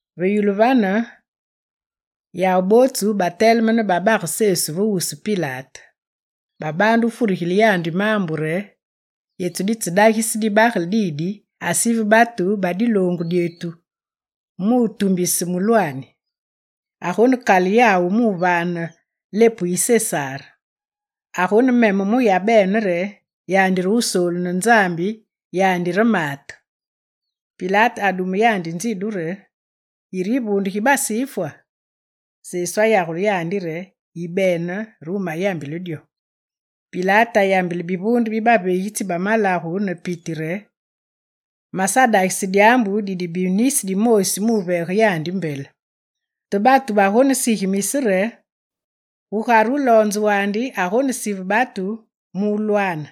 Ve yulu vane yawu bootsu bateleme ne babage Sesu ve wusu Pilate. Babaande wufurigile yandi maambu re: «Yetu ditsedagise dibagele didi asive batu ba diloongu dyetu mu wutumbise mulwaani. Agonekale yawu wuvaane lepu gu Sesar. Agonememe mu yabene re: yandi re Wusoolu ne Nzambi, yandi re Maate.» Pilate adume yandi nzidu re: «Yire yivuunde gi Basifwa?» Sesu ayagule yandi re: «Yibene re wumayambile dyo.» Pilate ayambile bivuunde bi baveegitsi ba malagu ne piti re: «Masadagise dyaambu didibi nisi dimoosi muveege yandi mbele.» Te batu bagonesigimise re: «Gugare wuloonze wandi agonesive batu mu wulwaane.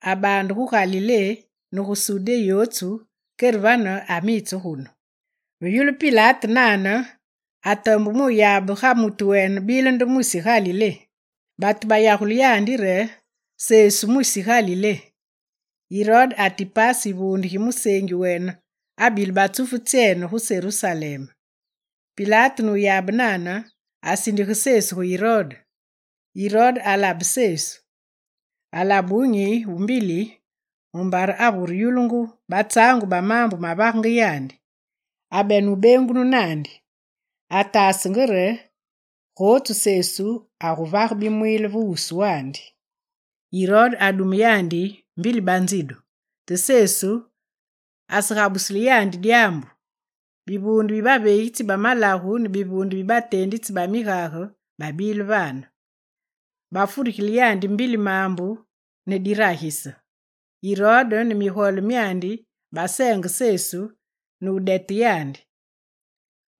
Abaande gu Galilé ne gu Sudé yotsu, kere vane amitse ne gunu.» Ve yulu Pilate nane, atombe mu wuyabe ga mutu wene bile nde mwisi Galilé. Batu bayagule yandi re: «Sesu mwisi Galilé.» Irode Atipase yivuunde gi museengi wene abile batsufu tsyene gu Serusalem. Pilate nuyabe nane asindige Sesu gu Irode. Irode alabe Sesu. Alabe wunyi wu mbili mumbare avureyulungu batsaangu ba maambu mavagenge yandi, abenenge wubeengunu naandi. Ataasenge re gotsu Sesu aguvage bimwiile ve wuswandi. Irode adume yandi mbili banzidu, te Sesu asegabusile yandi dyaambu. Bivuunde bi baveegitsi ba malagu ne bivuunde bi bateenditsi ba migage babile vane. Bafurigilenge yandi mbili maambu ne diragise. Irode ne migole myandi baseenge Sesu ne wudete yandi.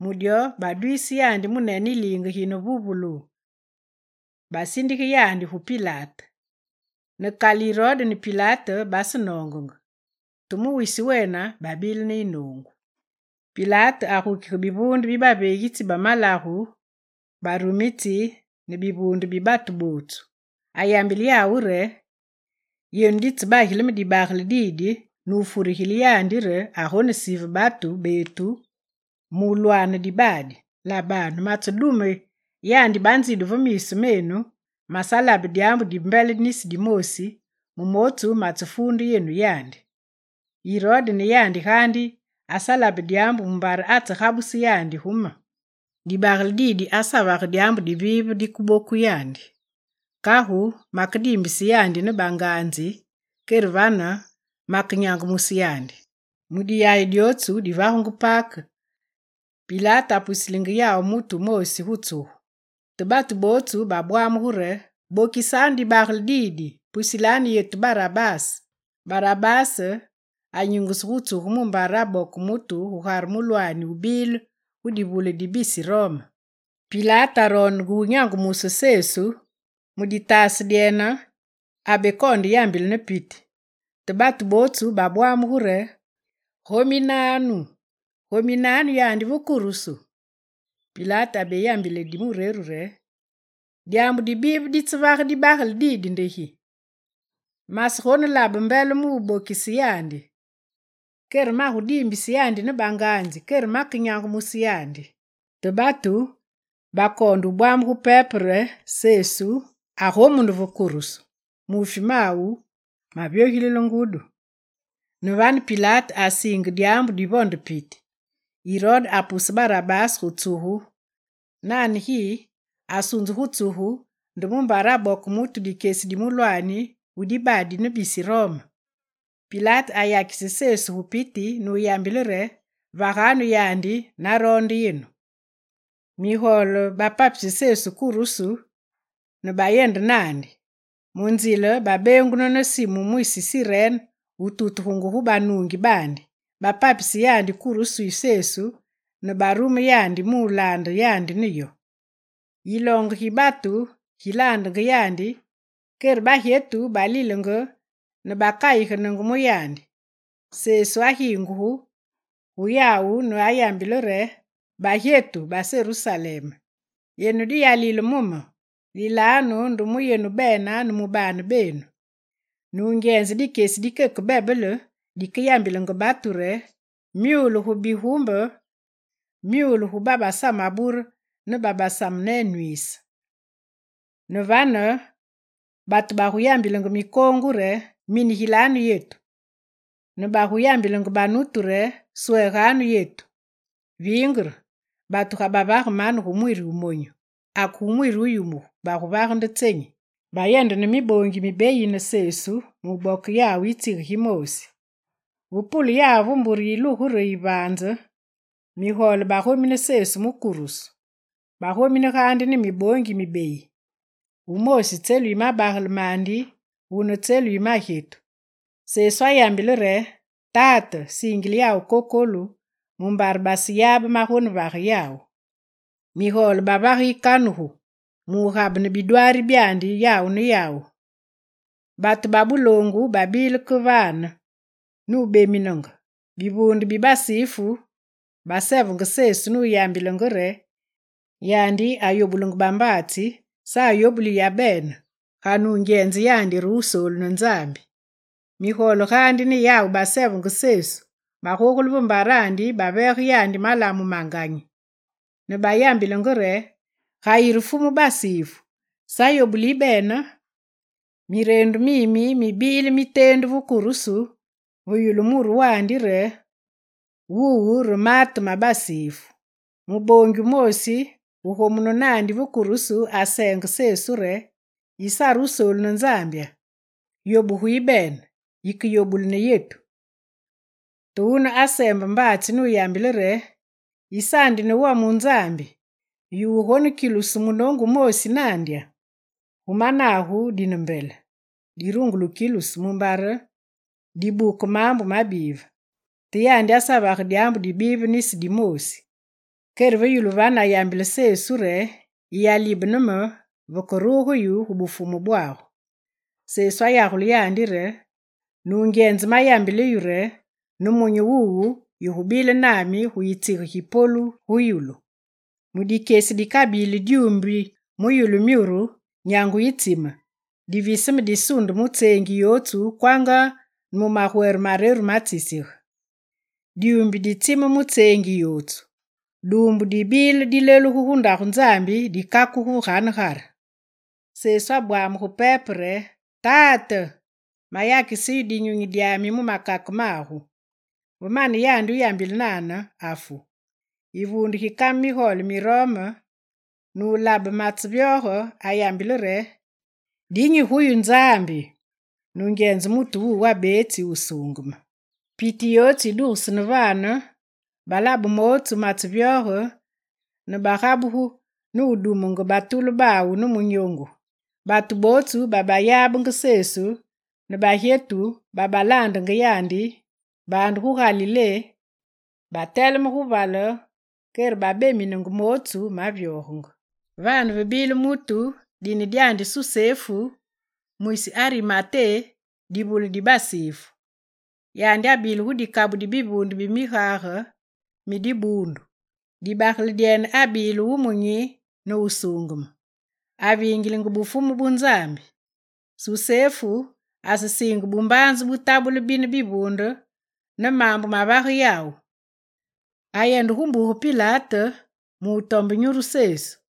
Mu dyo, badwiise yandi munene yiliinge gi ne vuvulu, basindige yandi gu Pilate. Ne kale Irode ne Pilate basenoongenge, te mu wisi wene babile ne yinoongu. Pilate agukige bivuunde bi baveegitsi ba malagu, barumitsi ne bivuunde bi batu bootsu. Ayambile yawu re: «Yenu ditsebagile me dibagele didi nu wufurigile yandi re agonesive batu betu mulwaane dibaadi. Labanu matsedume yandi banzidu ve miisu menu, masalabe dyaambu di mbele nisi dimoosi mu mootsu matsefuunde yenu yandi. Irode ne yandi gaandi asalabe dyaambu mumbare atsegabuse yandi gu me. Dibagele didi asavage dyaambu dibive dikeboku yandi. Kagu makediimbise yandi ne banganzi kere vane makenyangumuse yandi.» [ Mu diyayi dyotsu divagungu Pake, Pilate apusilenge yawu mutu wumoosi gu tsugu.] Te batu bootsu babwamugu re: «Bokise dibagele didi, pusile yetu Barabase!» Barabase anyingusu gu tsugu mumbare aboke mutu gugare mulwaani wubile gu divule ne bisi Rome. Pilate aroondenge wunyangumuse Sesu, mu ditaase dyene, abekoonde yambile ne piti. Te batu bootsu babwamugu re: «Gominanu, gominanu yandi ve kurusu!» Pilate abeyambile di mureru re: «Dyaambu dibive ditsevage dibagele didi nde gi? Masegonelabe mbele mu wubokise yandi. Kagu magudiimbise yandi ne banganzi, kere make nyangumuse yandi.» Te batu bakoonde wubwamugu pepe re Sesu agomunu ve kurusu, muufi mawu mavyogilile ngudi. Ne vane Pilate asiingise dyaambu divonde piti. Irode apuse Barabase gu tsugu nane gi, asunzu gu tsugu nde mumbare aboke mutu dikyesi di mulwaani wu dibaadi ne bisi Rome. Pilate ayakise Sesu gu piti nuyambile re: «Vaganu yandi naroonde yenu.» Migole bapapise Sesu kurusu ne bayende naandi. Mu nzile babeengunu ne Simu mwisi Sirene wututugungu gu banuungi baandi, bapapise yandi kurusu yi Sesu ne barume yandi mu wulaande yandi ne yo. Yiloonge gi batu gilaandenge yandi, kere bagyetu balilenge ne bakayigenenge mu yandi. Sesu agingugu gu yawu nuyambile re: «Bagyetu ba Serusalem, yenu diyalile mu me! Lilanu nde mu yenu bene ne mu baane benu. Nungyenze dikyesi dikeke bebele dikeyambilenge batu re: “Myule gu bigumbe, myule gu babasamabure ne gu babasamenwiise.” Ne vane batu baguyambilenge mikoongu re: “Minigilanu yetu.” Ne baguyambilenge banutu re: “Sweeganu yetu.” Vingere, batu ga bavage mane gu mwiri wumonyu, ake gu mwiri wuyumugu baguvage nde tsenyi?» Bayende ne miboongi mibeyi ne Sesu mu wuboke yawu yitsige gimoosi. Ve pule yawu ve mbure yilugu re yivaanze, migole bagomine Sesu mu kurusu. Bagomine gaandi ne miboongi mibeyi. Wumoosi tselu yi mabagele mandi, wune tselu yi magyetu. Sesu ayambile re: «Tate, siingile yawu kokolu mumbare baseyabe magonevage yawu.» Migole bavage yikanugu mugabene bidwaari byandi yawu ne yawu. Batu ba buloongu babile ke vane nubeminenge. Bivuunde bi Basifu basevenge Sesu nuyambilenge re: «Yandi ayobulenge bambaatsi, sa ayobuli yabene, ga nungyenze yandi re Wusoolu ne Nzambi.» Migole gaandi ne yawu basevenge Sesu, bagogule ve mbarandi ne baveege yandi malamu ma nganyi. Ne bayambilenge re: «Ga yire fumu Basifu sa yobuli yibene!» Mireendu mimi mibile miteendu ve kurusu ve yulu muru wandi re: «Wuwu re Maate ma Basifu.» Muboongi wumoosi wugomunu naandi ve kurusu aseengenge Sesu re: «Yisare Wusoolu ne Nzambya? Yobuge yibene yike yobule ne yetu.» Te wune aseembe mbaatsi nuyambile re: «Yisaandi ne wome wu Nzambi, yu wugonekilusu munoongu wumoosi nandya? Gu managu dine mbele. Dirungule wukilusu, mumbare dibuke maambu mabive. Te yandi asavage dyaambu dibive nisi dimoosi.» Kere ve yulu vane, ayambile Sesu re: «Yiyalibene me vekeruge yu gu Bufumu bwagu.» Sesu ayagule yandi re: «Nungyenze mayambile yu re, nemunyi wuwu, yigubile nami gu yitsige gi polu gu yulu.» Mudikyesi dikabili dyumbi mu yulu myuru, nyangu yitsime diviseme disunde mu tseengi yotsu kwanga ne mu magwere mareru matsisige. Dyumbi ditsime mu tseengi yotsu. Duumbu dibile dilelugu gu Ndagu Nzambi dikakugu ve ganegare. Sesu abwamugu pepe re: «Tate, mayakise yu dinyunyi dyami mu makake magu.» Ve mane yandi wuyambile nane, afu. Yivuunde gi kame migole mi Rome ne wulabe matsevyoge, ayambile re: «Dinyi gu yu Nzambi! Nungyenze mutu wuwu abeetsi wusuungeme.» Piti yotsu yidugesene vane, balabe mootsu matsevyoge ne bagabugu ne wudumenge batulu ne munyoongu. Batu bootsu babayabenge Sesu ne bagyetu babalaandenge yandi baande gu Galilé, bateleme gu vale kere bebeminenge mootsu mavyogenge. Vane, vebile mutu dine dyandi Susefu, mwisi Arimaté divule di Basifu. Yandi abile gu dikabu di bivuunde bi migage mi dibuundu. Dibagele dyene abile wumunyi ne wusuungeme. Avingilenge Bufumu bu Nzambi. Susefu asesiinge bumbaanze butabule bine bivuunde ne maambu mavage yawu. Ayende gu Pilate mutombe nyuru Sesu.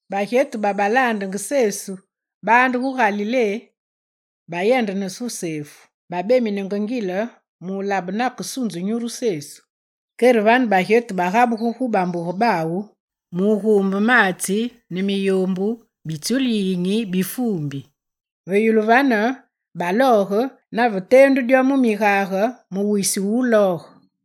Bagyetu babalaandenge Sesu baande gu Galilé bayende gu Susefu. Babeminenge ngile mu wulabe nakesunzu nyuru Sesu. Kere vane bagyetu bagabugu gu bambuge bawu mu wuguumbe maatsi ne miyoombu mi tsulu yiyinyi bi fuumbi. Ve yulu vane balooge nave teendu dyo mu migage, mu wisi wulooge.